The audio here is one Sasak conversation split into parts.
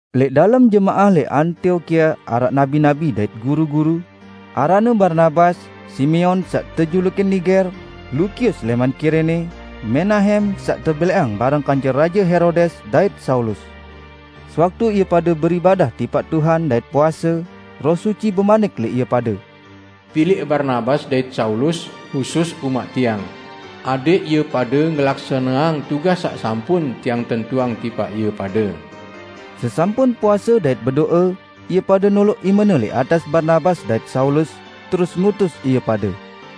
Lẽq dalem jemaah lẽq Antiokia araq nabi-nabi dait guru-guru, aranne Barnabas, Simeon saq tejulukin Niger, Lukius lẽman Kirene, Menahem saq tebelẽqang bareng kance Raje Herodes, dait Saulus. Sewaktu ie pade beribadah tipaq Tuhan dait puase, Roh Suci bemanik lẽq ie pade, "Pilẽq Barnabas dait Saulus husus umaq Tiang, adẽq ie pade ngelaksaneang tugas saq sampun Tiang tentuang tipaq ie pade." Sesampun puase dait bedo'e, ie pade noloq imene lẽq atas Barnabas dait Saulus, terus ngutus ie pade.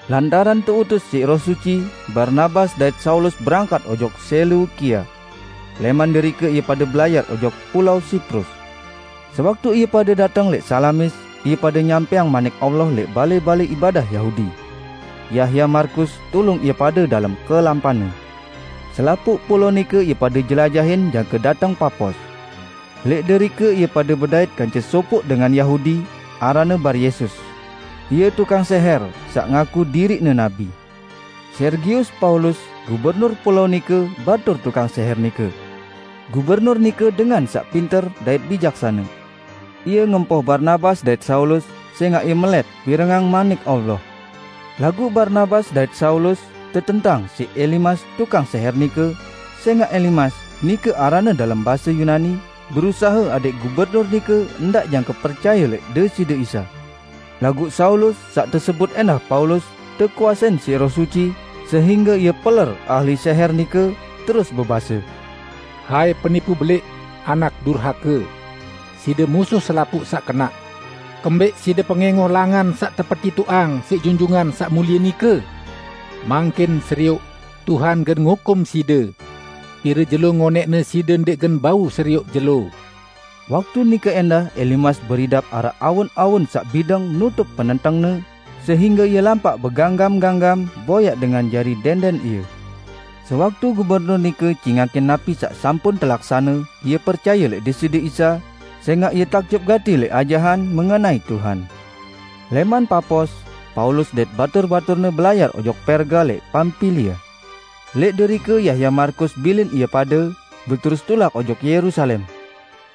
Lantaran teutus siq Roh Suci, Barnabas dait Saulus berangkat ojok Seleukia. Lẽman derike ie pade belayar ojok pulao Siprus. Sewaktu ie pade dateng lẽq Salamis, ie pade nyampẽang Manik Allah lẽq balẽ-balẽ ibadah Yahudi. Yahya Markus tulung ie pade dalem kelampanne. Selapuq pulao nike ie pade jelajahin jangke dateng Papos. Lẽq derike ie pade bedait kance sopoq dengan Yahudi, aranne Baryesus. Ie tukang sẽhẽr saq ngaku diriqne nabi. Sergius Paulus, gubernur pulao nike batur tukang sẽhẽr nike. Gubernur nike dengan saq pinter dait bijaksane. Ie ngempoh Barnabas dait Saulus, sẽngaq ie melẽt pirengang Manik Allah. Laguq Barnabas dait Saulus tetentang siq Elimas tukang sẽhẽr nike, sẽngaq Elimas (nike aranne dalem base Yunani) berusahe adẽq gubernur nike ndaq jangke percaye lẽq Deside Isa. Laguq Saulus -- saq tesebut ẽndah Paulus -- tekuasein siq Roh Suci, sehingge ie peler ahli sẽhẽr nike, terus bebase, "Hai, penipu belẽq, anak durhake! Side musuh selapuq saq kenaq. Kembẽq side pengẽngoh Langan saq tepetitoqang siq Junjungan Saq Mulie nike? Mangkin serioq, Tuhan gen ngukum side! Pire jelo ngonẽqne side ndẽq gen bau serioq jelo." Waktu nike ẽndah Elimas beridap araq awun-awun saq bideng nutup penentengne, sehingge ie lampaq beganggam-ganggam boyaq dengan jari dẽndẽn ie. Sewaktu Gubernur nike cingakin napi saq sampun telaksane, ie percaye lẽq Deside Isa; sẽngaq ie takjub gati lẽq ajahan mengenai Tuhan. Lẽman Papos, Paulus dait batur-baturne belayar ojok Perga lẽq Pampilia. Lẽq derike Yahya Markus bilin ie pade, beterus tulak ojok Yerusalem.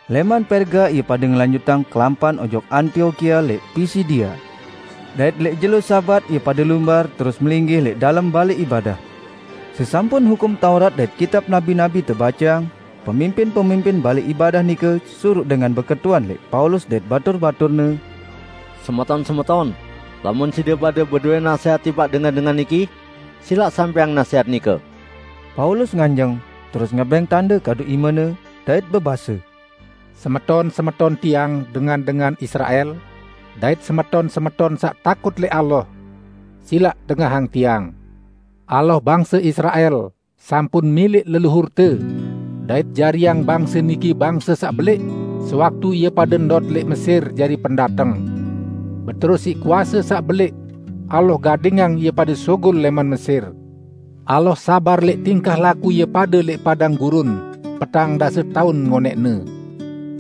Lẽman Perga ie pade ngelanjutang kelampan ojok Antiokia lẽq Pisidia, dait lẽq jelo Sabat ie pade lumbar terus melinggih lẽq dalem balẽ ibadah. Sesampun Hukum Taurat dait kitab nabi-nabi tebaceang, pemimpin-pemimpin balẽ ibadah nike suruq dengan beketuan lẽq Paulus dait batur-baturne, "Semeton-semeton, lamun side pade bedowẽ nasẽhat tipaq dengan-dengan niki, silaq sampẽang nasẽhat nike." Paulus nganjeng, terus ngebẽng tande kadu imene, dait bebase, "Semeton-semeton tiang dengan-dengan Israel dait semeton-semeton saq takut lẽq Allah! Silaq dengahang tiang: Allah bangse Israel sampun milẽq leluhurte, dait jariang bangse niki bangse saq belẽq sewaktu ie pade ndot lẽq Mesir jari pendateng. Beterus siq kuase saq belẽq Allah gadingang ie pade sugul lẽman Mesir. Allah sabar lẽq tingkah laku ie pade lẽq padang gurun petang dase taun ngonẽqne.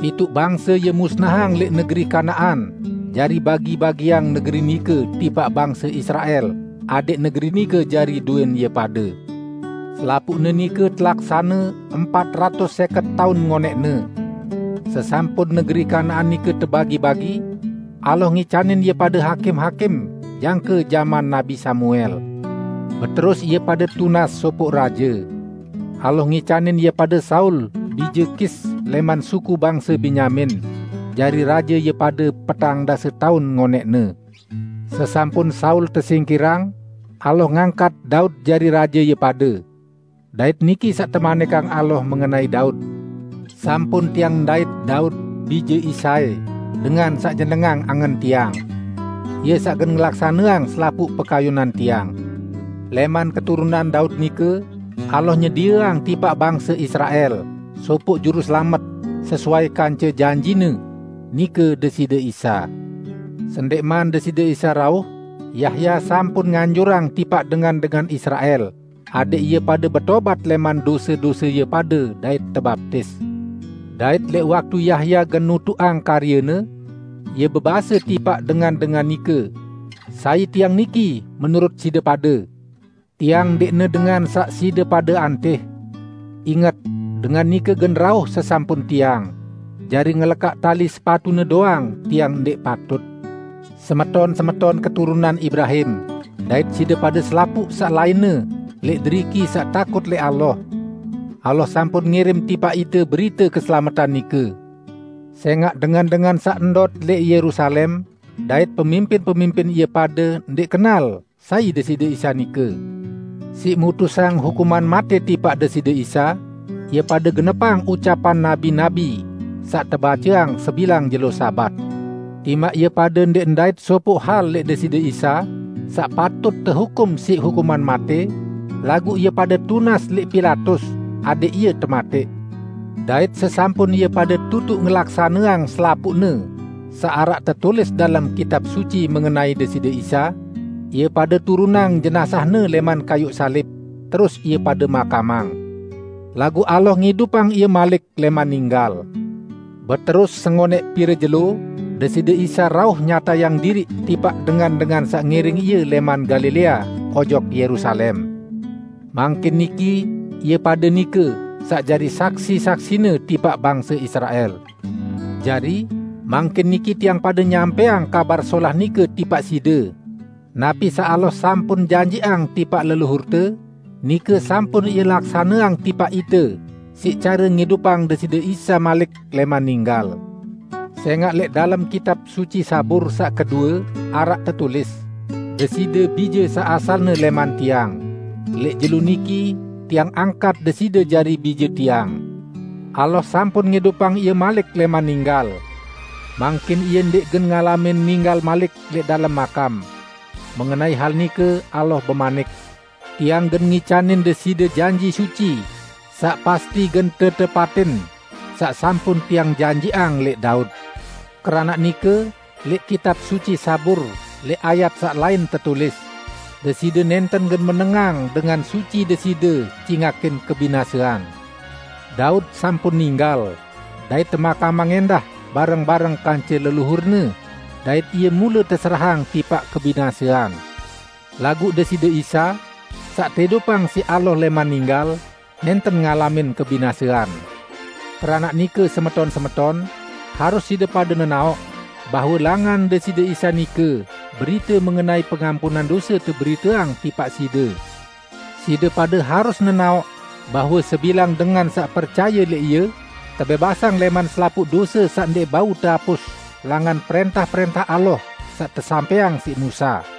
Pituq bangse Ie musnahang lẽq negeri Kanaan jari bagi-bagiang negeri nike tipaq bangse Israel adẽq negeri nike jari dowẽn ie pade. Selapuqne nike telaksane empat ratus sẽket taun ngonẽqne. Sesampun negeri Kanaan nike tebagi-bagi, Allah ngicanin ie pade hakim-hakim jangke jaman Nabi Samuel. Beterus ie pade tunas sopoq raje. Allah ngicanin ie pade Saul bije Kis lẽman suku bangse Benyamin jari raje ie pade petang dase taun ngonẽqne. Sesampun Saul tesingkirang, Allah ngangkat Daud jari raje ie pade. Dait niki saq temanikang Allah mengenai Daud, 'Sampun tiang ndait Daud bije Isai dengan saq nyenengang angen Tiang. Ie saq gen ngelaksaneang selapuq pekayunan Tiang.' Lẽman keturunan Daud nike Allah nyedieang tipaq bangse Israel sopoq Juruselamet, sesuai kance janji-Ne. Nike Deside Isa. Sendẽqman Deside Isa rauh, Yahya sampun nganjurang tipaq dengan-dengan Israel adẽq ie pade betobat lẽman dose-dose ie pade dait tebaptis. Dait lẽq waktu Yahya gen nutuqang karyene, ie bebase tipaq dengan-dengan nike, 'Sai tiang niki menurut side pade? Tiang ndẽqne Dengan saq side pade antih. Inget, Dengan nike gen rauh sesampun tiang; jari ngelekaq tali sepatu-Ne doang tiang ndẽq patut.' Semeton-semeton keturunan Ibrahim, dait side pade selapuq saq lainne lẽq deriki saq takut lẽq Allah! Allah sampun ngirim tipaq ite berite keselametan nike; sẽngaq dengan-dengan saq ndot lẽq Yerusalem dait pemimpin-pemimpin ie pade ndẽq kenal sai Deside Isa nike. Siq mutusang hukuman matẽ tipaq Deside Isa, ie pade genepang ucapan nabi-nabi saq tebaceang sebilang jelo Sabat. Timaq ie pade ndẽq ndait sopoq hal lẽq Deside Isa saq patut tehukum siq hukuman matẽ, laguq ie pade tunas lẽq Pilatus adẽq Ie tematẽq. Dait sesampun ie pade tutuq ngelaksaneang selapuqne saq araq tetulis dalem Kitab Suci mengenai Deside Isa, ie pade turunang jenazah-Ne lẽman kayuq salib, terus ie pade makamang. Laguq Allah ngidupang Ie malik lẽman ninggal. Beterus sengonẽq pire jelo Deside Isa rauh nyatayang diriq tipaq dengan-dengan saq ngiring Ie lẽman Galilea ojok Yerusalem. Mangkin niki ie pade nike saq jari saksi-saksi-Ne tipaq bangse Israel. Jari, mangkin niki tiang pade nyampẽang Kabar Solah nike tipaq side: Napi saq Allah sampun janjiqang tipaq leluhurte, nike sampun Ie laksaneang tipaq ite siq care ngidupang Deside Isa malik lẽman ninggal. Sẽngaq lẽq dalem Kitab Suci Zabur saq kedue araq tetulis, 'Deside Bije saq asalne lẽman Tiang, lẽq jelo niki Tiang angkat Deside jari Bije Tiang.' Allah sampun ngidupang Ie malik lẽman ninggal. Mangkin Ie ndẽq gen ngalamin ninggal malik lẽq dalem makam. Mengenai hal nike Allah bemanik, 'Tiang gen ngicanin Deside janji suci saq pasti gen tetepatin, saq sampun Tiang janjiqang lẽq Daud.' Keranaq nike lẽq Kitab Suci Zabur lẽq ayat saq lain tetulis, 'Deside nẽnten gen menengang Dengan Suci Deside cingakin kebinasean.' Daud sampun ninggal dait temakamang ẽndah bareng-bareng kance leluhurne, dait ie mule teserahang tipaq kebinasean. Laguq Deside Isa, saq teidupang siq Allah lẽman ninggal, nẽnten ngalamin kebinasean. Keranaq nike semeton-semeton, harus side pade nenaoq bahwe langan Deside Isa nike berite mengenai pengampunan dose teberiteang tipaq side; side pade harus nenaoq bahwe sebilang dengan saq percaye lẽq Ie, tebẽbasang lẽman selapuq dose saq ndẽq bau teapus langan prẽntah-prẽntah Allah saq tesampẽang siq Musa.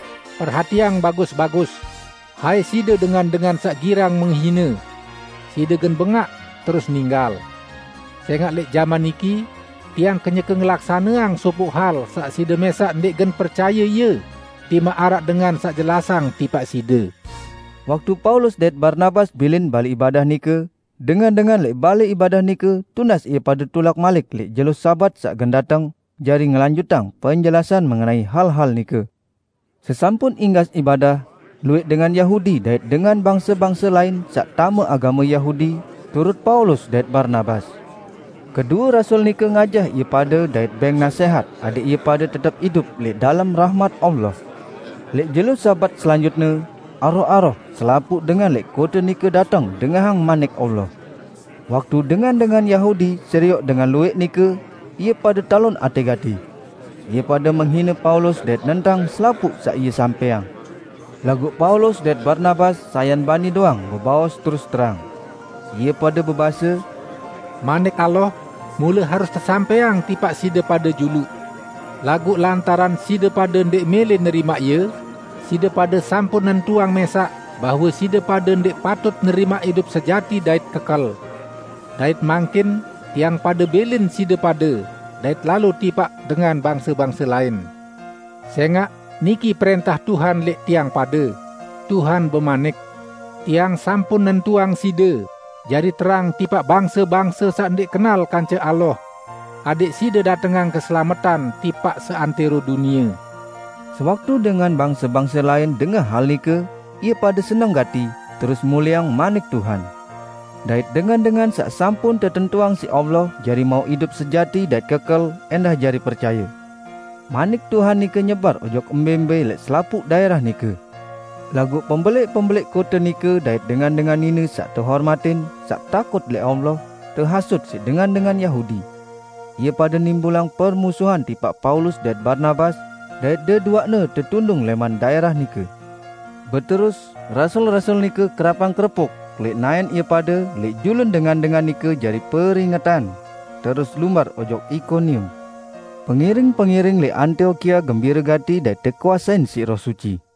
'Perhatiang bagus-bagus, hai side dengan-dengan saq girang menghine! Side gen bengaq, terus ninggal! Sẽngaq lẽq jaman niki Tiang kenyeke ngelaksaneang sopoq hal saq side mẽsaq ndẽq gen percaye ie, timaq araq dengan saq jelasang tipaq side.' " Waktu Paulus dait Barnabas bilin balẽ ibadah nike, dengan-dengan lẽq balẽ ibadah nike tunas ie pade tulak malik lẽq jelo Sabat saq gen dateng, jari ngelanjutang penjelasan mengenai hal-hal nike. Sesampun inggas ibadah, luwẽq dengan Yahudi dait dengan bangse-bangse lain saq tame agame Yahudi, turut Paulus dait Barnabas; kedue rasul nike ngajah ie pade dait bẽng nasẽhat adẽq ie pade tetep idup lẽq dalem rahmat Allah. Lẽq jelo Sabat selanjutne, aroh-aroh selapuq dengan lẽq kote nike dateng dengahang Manik Allah. Waktu dengan-dengan Yahudi serioq dengan luwẽq nike, ie pade talon atẽ gati. Ie pade menghine Paulus dait nentang selapuq saq ie sampẽang. Laguq Paulus dait Barnabas sayan bani doang bebaos terus terang. Ie pade bebase, "Manik Allah mule harus tesampẽang tipaq side pade juluq. Laguq lantaran side pade ndẽq mẽlẽ nerimaq ie, side pade sampun nentuang mẽsaq bahwe side pade ndẽq patut nerimaq idup sejati dait kekel. Dait mangkin tiang pade bilin side pade dait lalo tipaq dengan bangse-bangse lain. Sẽngaq niki prẽntah Tuhan lẽq tiang pade; Tuhan bemanik, 'Tiang sampun nentuang side jari terang tipaq bangse-bangse saq ndẽq kenal kance Allah, adẽq side datengang keselametan tipaq seantẽro dunie.' " Sewaktu dengan bangse-bangse lain dengah hal nike, ie pade seneng gati, terus mulieang Manik Tuhan. Dait dengan-dengan saq sampun tetentuang siq Allah jari mauq idup sejati dait kekel ẽndah jari percaye. Manik Tuhan nike nyebar ojok mbẽ-mbẽ lẽq selapuq daẽrah nike. Laguq pembelẽq-pembelẽq kote nike dait dengan-dengan nine saq tehormatin, saq takut lẽq Allah, tehasut siq dengan-dengan Yahudi. Ie pade nimbulang permusuhan tipaq Paulus dait Barnabas, dait deduaqne tetundung lẽman daẽrah nike. Beterus, rasul-rasul nike kerapang kerepuk lẽq naẽn ie pade lẽq julun dengan-dengan nike jari peringetan, terus lumbar ojok Ikonium. Pengiring-pengiring lẽq Antiokia gembire gati dait tekuasein siq Roh Suci.